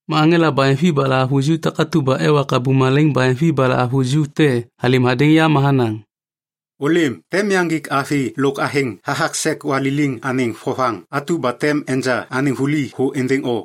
Ma aŋela baheŋvi ba lahavuju takatu ba ewa kabum malaiŋ baheŋvi ba lahavuju te halêm hadêŋ ya ma hanaŋ, “Ôlêm, tem yaŋgik avi lôk athêŋ hathak sek waliliŋ anêŋ vovaŋ atu ba tem enja anêŋ vuli thô êndêŋ o.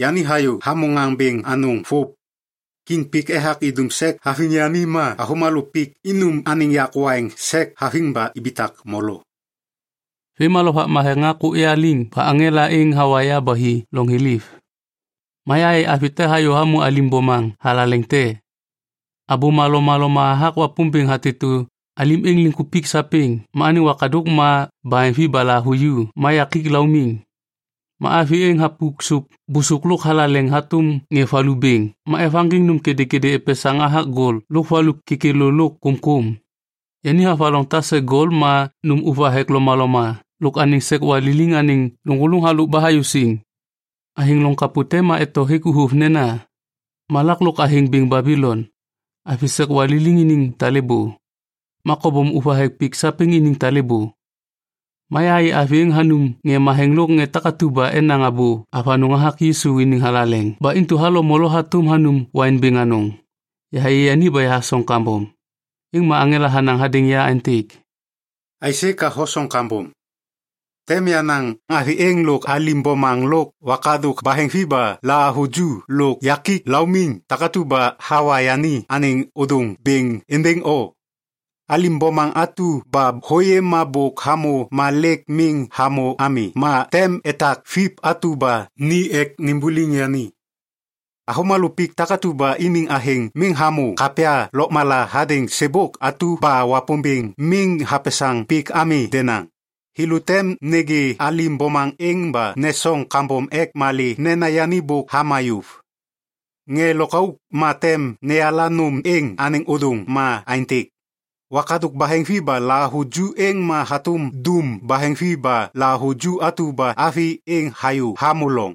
Yani hayô hamô ŋaŋ bêŋ anôŋ vôv. Kiŋ pik ethak idum sek haviŋ yani ma avômalô pik inum anêŋ yak waiŋ sek haviŋ ba ibitak molo.” Vêm ma Lovak Matheŋ hakôk ya liŋ ba aŋela êŋ hawa ya ba hi loŋ thiliv. Ma yahayê avi te hayô hamô alim bomaŋ thalaleŋ te. Abôma lomaloma hathak Wapômbêŋ hatêtô alim êŋ liŋkupik sapêŋ ma anêŋ wakadôk ma baheŋvi ba lahavuju ma yakik laumiŋ. Ma avi êŋ hapuk sôp bôsôk lôk thalaleŋ hatôm ŋê valu bêŋ ma evaŋgiŋ nôm kêdêkêdê epesaŋ hathak gol lôk valu kêkêlô lôk kômkôm. Yani havaloŋ tase gol ma nôm ôvathek lomaloma lôk anêŋ sek waliliŋ anêŋ lôŋgôlôŋ halôk ba hayô siŋ. Athêŋ loŋ kapô te ma eto hêk uvôv nena, “Malak lôk athêŋ bêŋ Babilon, avi sek waliliŋ iniŋ talêbô, ma kobom ôvathek pik sapêŋ iniŋ talêbô.” Ma yahayê avi êŋ hanum ŋê matheŋ lôk ŋê takatu ba enaŋ abô avanôŋ hathak Yisu iniŋ thalaleŋ ba intu halo molo hatôm hanum waiŋ bêŋ anôŋ. Yahayê yani ba yahasoŋ kambom. Êŋ ma aŋela hanaŋ hadêŋ ya aêntêk, “Aisê ka hosoŋ kambom? Tem yanaŋ avi êŋ lôk alim bomaŋ lôk wakadôk baheŋvi ba lahavuju lôk yakik laumiŋ takatu ba hawa yani anêŋ ôdôŋ bêŋ êndêŋ o. Alim bomaŋ atu ba hôyê ma bôk hamô ma lêk miŋ hamô ami ma tem etak Viv atu ba ni ek nimbuliŋ yani. Avômalô pik takatu ba iniŋ athêŋ miŋ hamô kapya lôkmala hadêŋ sêbôk atu ba Wapômbêŋ miŋ hapesaŋ pik ami denaŋ, thêlô tem nêgê alim bomaŋ êŋ ba nesoŋ kambom ek malê nena yani bôk hama yôv. “Ŋê lôkauk ma tem neyala nôm êŋ anêŋ ôdôŋ ma aêntêk: Wakadôk baheŋvi ba lahavuju êŋ ma hatôm dum baheŋvi ba lahavuju atu ba avi êŋ hayô hamô loŋ.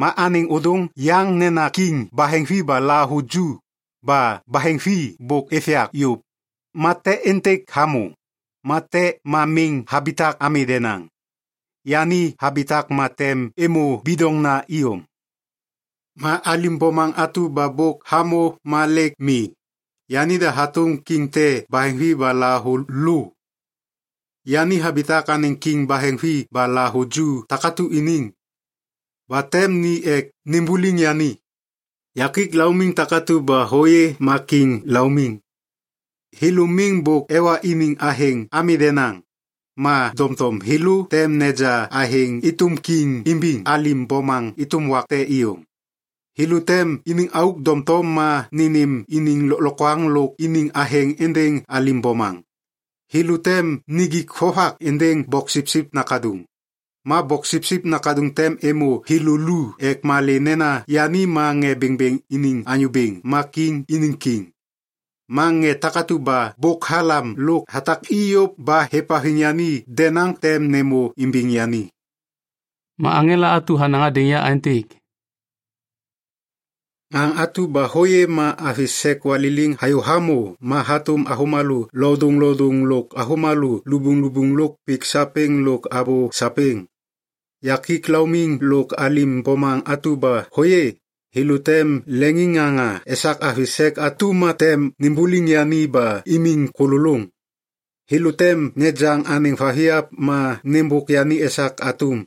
Ma anêŋ ôdôŋ yaŋ nena kiŋ baheŋvi ba lahavuju, ba baheŋvi bôk êv yak yôv, ma te êntêk hamô, ma te ma miŋ habitak ami denaŋ. Yani habitak ma tem êmô bidoŋna iyom. Ma alim bomaŋ atu ba bôk hamô ma lêk mi, yanida hatôm kiŋ te baheŋvi ba lahavulô. Yani habitak anêŋ kiŋ baheŋvi ba lahavuju takatu iniŋ. Ba tem ni ek nimbuliŋ yani. “Yakik laumiŋ takatu ba hôyê ma kiŋ laumiŋ. Thêlô miŋ bôk ewa iniŋ athêŋ ami denaŋ, ma doŋtom thêlô tem neja athêŋ êtôm kiŋ imbiŋ alim bomaŋ êtôm wak te iyom. Thêlô tem iniŋ auk doŋtom ma nênêm iniŋ lôklokwaŋ lôk iniŋ athêŋ êndêŋ alim bomaŋ. Thêlô tem nijik vovak êndêŋ Boksipsip Nakaduŋ, ma Boksipsip Nakaduŋ tem êmô thêlô lu ek malê nena yani ma ŋê bêŋbêŋ iniŋ Anyô Bêŋ ma kiŋ iniŋ Kiŋ. Ma ŋê takatu ba bôk halam lôk hatak i yôv ba êvhaviŋ yani dedauŋ tem nêmô imbiŋ yani.” Ma aŋela atu hanaŋ hadêŋ ya aêntêk, “Ŋaŋ atu ba hôyê ma avi sek waliliŋ hayô hamô ma hatôm avômalô lodôŋlodôŋ lôk avômalô lubuŋlubuŋ lôk pik sapêŋ lôk abô sapêŋ. Yakik laumiŋ lôk alim bomaŋ atu ba hôyê, thêlô tem leŋiŋŋaŋa esak avi sek atu ma tem nimbuliŋ yani ba imiŋ kôlôlôŋ. Thêlô tem nejaŋ anêŋ vathiap ma nêmbôk yani esak atum.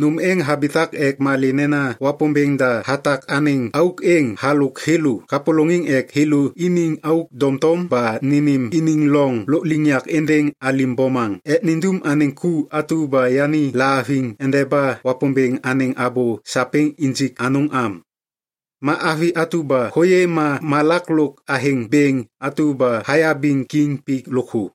Nôm êŋ habitak ek malê nena Wapômbêŋ da hatak anêŋ auk êŋ halôk thêlô kapôlôŋiŋ ek thêlô iniŋ auk doŋtom ba nênêm iniŋ loŋ lôkliŋyak êndêŋ alim bomaŋ ek nindum anêŋ ku atu ba yani lahaviŋ endeba Wapômbêŋ anêŋ abô sapêŋ injik anôŋ am. Ma avi atu ba hôyê ma malak lôk athêŋ bêŋ atu ba hayabiŋ kiŋ pik lôkthô.”